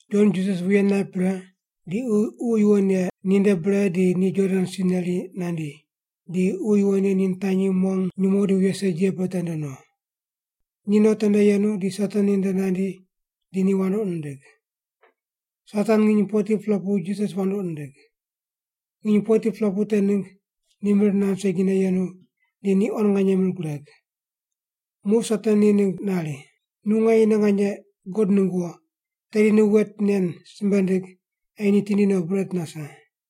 Jon Jisas wuye naip pre di Ququ Yuwon Ye ni nde bre di ni Jordan si neri nandi, di Ququ Yuwon Ye ni nitanyi mong nyumo di wuye segi ye pe tende no. Ni tende yenu di Satan ni nde nandi di ni wandoqi nindig. Satan nginy 40-pela pu Jisas wandoqi nindig. Nginy 40-pela pu te ningg ni mir nand segine yenu, di ni quan nganye mir gureg. Muq Satan ni ningg nari, “Nu nganyene nganye God ningg wo, tedi nu wet nen simbe ndig ei ni tindi no bret nase.”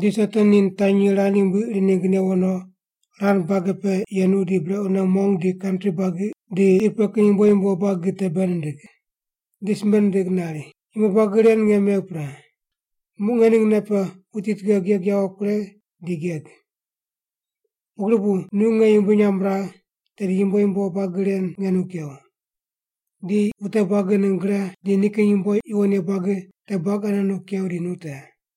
Di Satan ni nitanyi rand yumbui iri ningg newo no, rand bage pe yenu di brequne mong di kantri buagi di qi pe kin yumbo yumbo buagi te bei nindig. Di simbe nindig nari, “Yumbo buagi ren nge megh pre. Muq nge ning nei pe wuti tughe geg yawo kuregh di geg. Pugri bu nu nge yumbui nyamb ragh, tedi yumbo yumbo buagi ren nge nu kew. Di wute buagi ningg gre di nikin yumbo yuwon ye buagi te buagi ane nu kew di nu te.”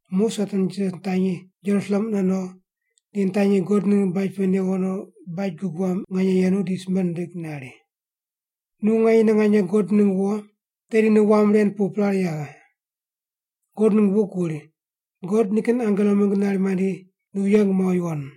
Muq Satan Jisas nitanyi Jerusalem mune no di nitanyi God ningg baj pe newo no baj gug wam nganye yenu di simbe nindig nari, “Nu nganyene nganye God ningg wo, tedi nu wam ren pu prare yaghe. God ningg buk wuri, ‘God nikin angelo ningg nari mandi nu yeng muaw yuwon.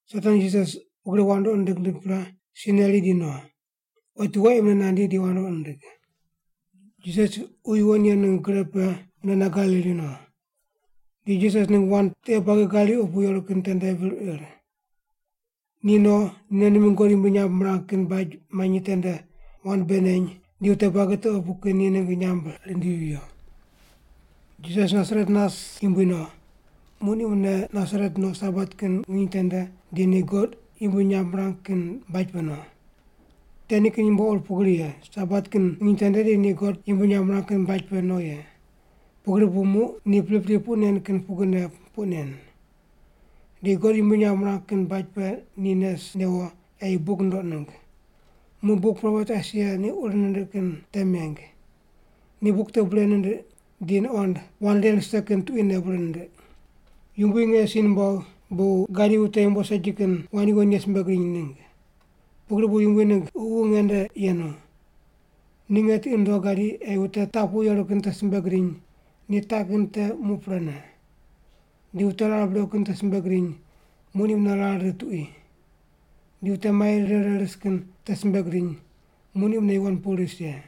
Satan Jisas pugri wandoqi nindig nindig pre, si neri di no. Otiwo ei mune nandi di wandoqi nindig. Jisas Ququ Yuwon Ye ningg gre pe munene Galili no. Di Jisas ningg wand tiqe buagi Galili opu yeru kin tende vir ir. Ni no ni mingg God yumbui nyamb mirang kin baj manyi tende wand bei neny di wute buagi te opu kin ni ningg nyamb rindivi viyo. Jisas Nasaret nas yumbui no. Muq ni mune Nasaret no Sabat kin nginy tende di ni God yumbui nyamb mirang kin baj pe no. Te nikin yumbo ur pugri ye Sabat kin nginy tende di ni God yumbui nyamb mirang kin baj pe no ye, pugri bu muq ni pripri puq nen kin pugrine puq nen. Di God yumbui nyamb mirang kin baj pe ni nes newo ei buk nundoq ningg. Muq buk propet Aisaia ni ur nindiq kin te meng. Ni buk te bure nindiq, di nuqond wand ren rise kin tuquine bure nindiq: “Yumbui nge si numbogh bu gadi wute yumbo segi kin wand yuwon ye simbe gidiny ningg. Pugri bu Yumbui ningg Ququ nge nde yenu. Ni nge tiqi nundogh gadi ei wute taq pu yeru kin te simbe gidiny ni taq kin te muq prene. Di wute rar brequ kin te simbe gidiny muq ni mune rar rit tuqui. Di wute mai rire rire ris kin te simbe gidiny, muq ni mune yuwon pu ris ye.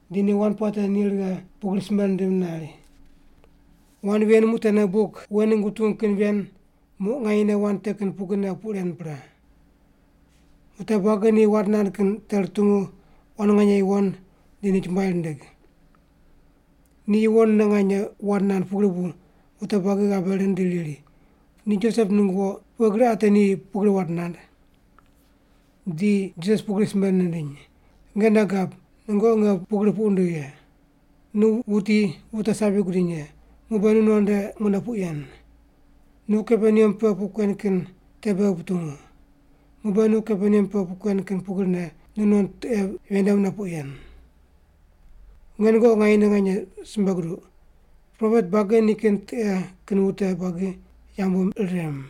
di ni wand puate ni righe pugri simbe nindim nari, “Wand ven muq tene buk wen ningg wutungu kin ven, muq nganyene wand te kin pugrine puq ren pre.” Wute buagi ni wand nand kin te rutungu quan nganye yuwon di ni chumbuai rindig. Ni yuwonne nganye wand nand pugri bu wute buagi ghabe rind di riri, “Ni Josep ningg wo, pughe gri ate ni pugri wand nand?” Di Jisas ni pugri simbe nindiny, “Nge nei gab, nungoqi nge pugri puq wundigh ye: ‘Nu wuti wute sabi gudiny ye, muq be nu non nde mune puq yen. Nu Kaperneam pe puq kuen kin te beghi putungu. Muq be nu Kaperneam pe puq kuen kin pugrine nu non tiqe pe ven nde mune puq yen.’ “Nge nungoqi nganyene nganye simbe guduq, propet buagi nikin tiqe kin wute buagi yambu rirem.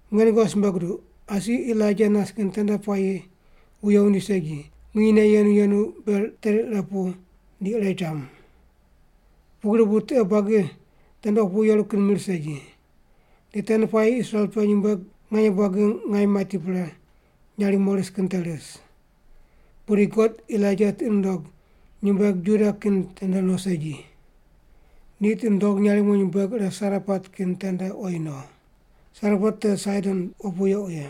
Nge nungoqi simbe guduq, asi Elaija nas kin tende puayi wuye wundi segi, nginyne yenu yenu ber teri ire pu di ire cham. Pugri bu tiqe buagi tende opu yeru kin mir segi. Di tende puayi Israel pe nyumbueg nganye buagi ngaim mati pre nyarimo ris kin te ris. Pudi God Elaija tiqi nundog nyumbueg Juda kin tende no segi. Ni tiqi nundog nyarimo nyumbueg ire Sarepat kin tende oyi no. Sarepat te Saidon opu yequ ye.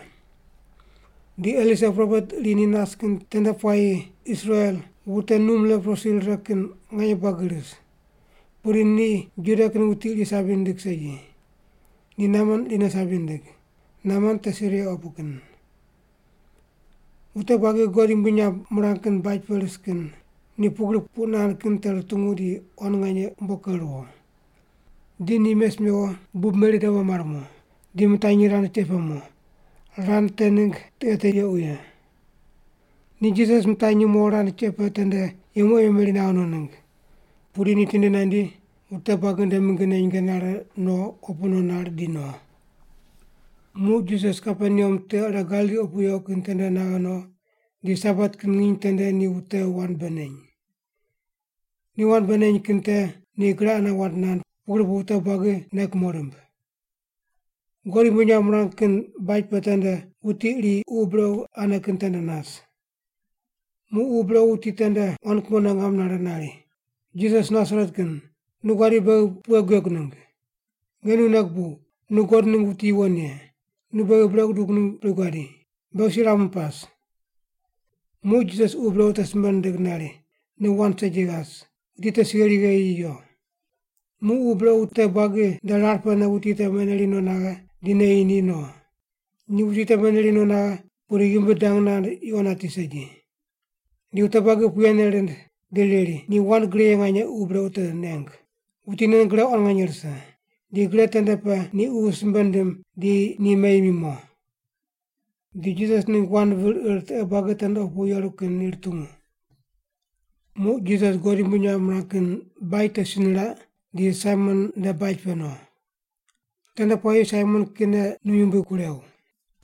Di Elisa propet iri ni nas kin tende puayi Israel wute num leprosi rire kin nganye buagi ris. Pudi ni Juda kin wuti iri sabi nindig segi. Ni Naman irine sabi nindig. Naman te Siria opu kin.” Wute buagi God yumbui nyamb mirang kin baj pe ris kin ni pugri puq nand kin te rutungu di quan nganye umbo ker ruwo. Di ni mes mewo bub meri dabo mar mo, di mitanyi rand cheq pe mo. Rand te ningg tiqe te yequ ye. Ni Jisas mitanyi mo rand cheq pe tende yemu ei memeri naghe no ningg. Pudi ni tindi nandi, wute buagi nde mingine nyinge nare no opu no nar, di no. Muq Jisas Kaperneam tiqe ire Galili opu yequ kin tende naghe no, di Sabat kin nginy tende ni wute wand bei neny. Ni wand bei neny kin te ni gre ane wand nand pugri bu wute buagi nei kumo rimb. God yumbui nyamb mirang kin baj pe tende wuti iri ququ brequ ane kin tende nas. Muq ququ brequ wuti tende quan kumone ngam nare nari, “Jisas Nasaret kin, nu guadi beghi pughe guegu ningg? Nge nu nei gubuw, nu God ningg wuti yuwon ye. Nu beghi brequ gudug ningg bri guadi? Beghi si ramu pas.” Muq Jisas ququ brequ te simbe nindig nari, “Nu wand segi ghas wuti te si gheri gheyi yi yo.” Muq ququ brequ wute buagi nde rar pene wuti te meneri no naghe, di neyi ni, no. Ni wuti te meneri no naghe, pudi ghimbi dang nand yuqo nati segi. Di wute buagi puyene rind di riri, “Ni wand gre ye nganye ququ brequ te neng. Wuti nen gre quan nganye rise. Di gre tende pe ni ququ simbe nindim di ni meyi mi mo.” Di Jisas ningg wand vir ir tiqe buagi tende opu yeru kin ni rutungu. Muq Jisas God yumbui nyamb mirang kin baj te si niraq, di Saimon nde baj pe no. Tende puayi Saimon kine num yumbui kurew,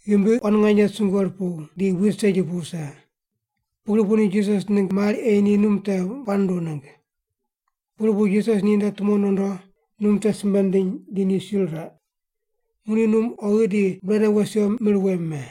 ghimbi quan nganye sungue rupuw, di buid segi pu wuse. Pugri bu ni Jisas ningg mari ei ni num te puaq nunduw ningg. Pugri bu Jisas ni nde tumo nondo, num te simbe nindiny di ni si riraq. Muq ni num oghi di brequne wes wiyo, mir wem me.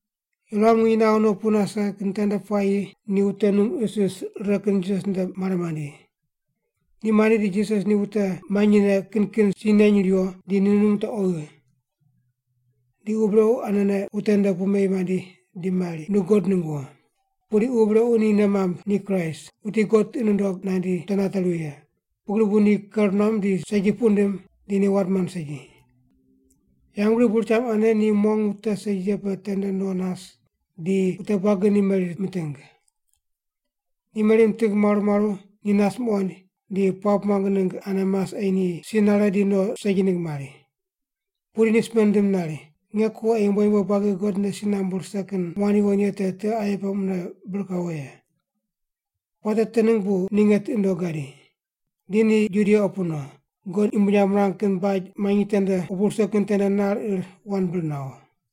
Yuram nginy naghe no pu nase kin tende puayi ni wute num isis rire kin Jisas nde mare mandi. Ni mandi di Jisas ni wute manyine kin kin si neny riwo, di ni num te oghi. Di ququ brequ anene wute nde pu meyi mandi di mari, “Nu God ningg wo.” Pudi ququ brequ ni nei mamb ni Kraist, wuti God tiqi nundog nandi wute nate ruwi ye, pugri bu ni ker nuam di segi puq nindim di ni wand mand segi. Yambgriq bur cham ane ni mong wute segi ye pe tende no nas, di wute buagi ni meri miting. Ni meri miting maru maru, ni nas muqoind, di puamb muang ningg ane mas ei ni si nare di no segi ningg mari. Pudi ni simbe nindim nari, “Nge ko ei yumbo yumbo buagi God nde si nambu rise kin wand yuwon ye te tiqe aye pe mune bir kawo ye. Puate te ningg bu ni nge tiqi nundogh gadi.” Di ni Judia opu no, God yumbui nyamb mirang kin baj manyi tende opu rise kin tende nar ir wand bir nawo.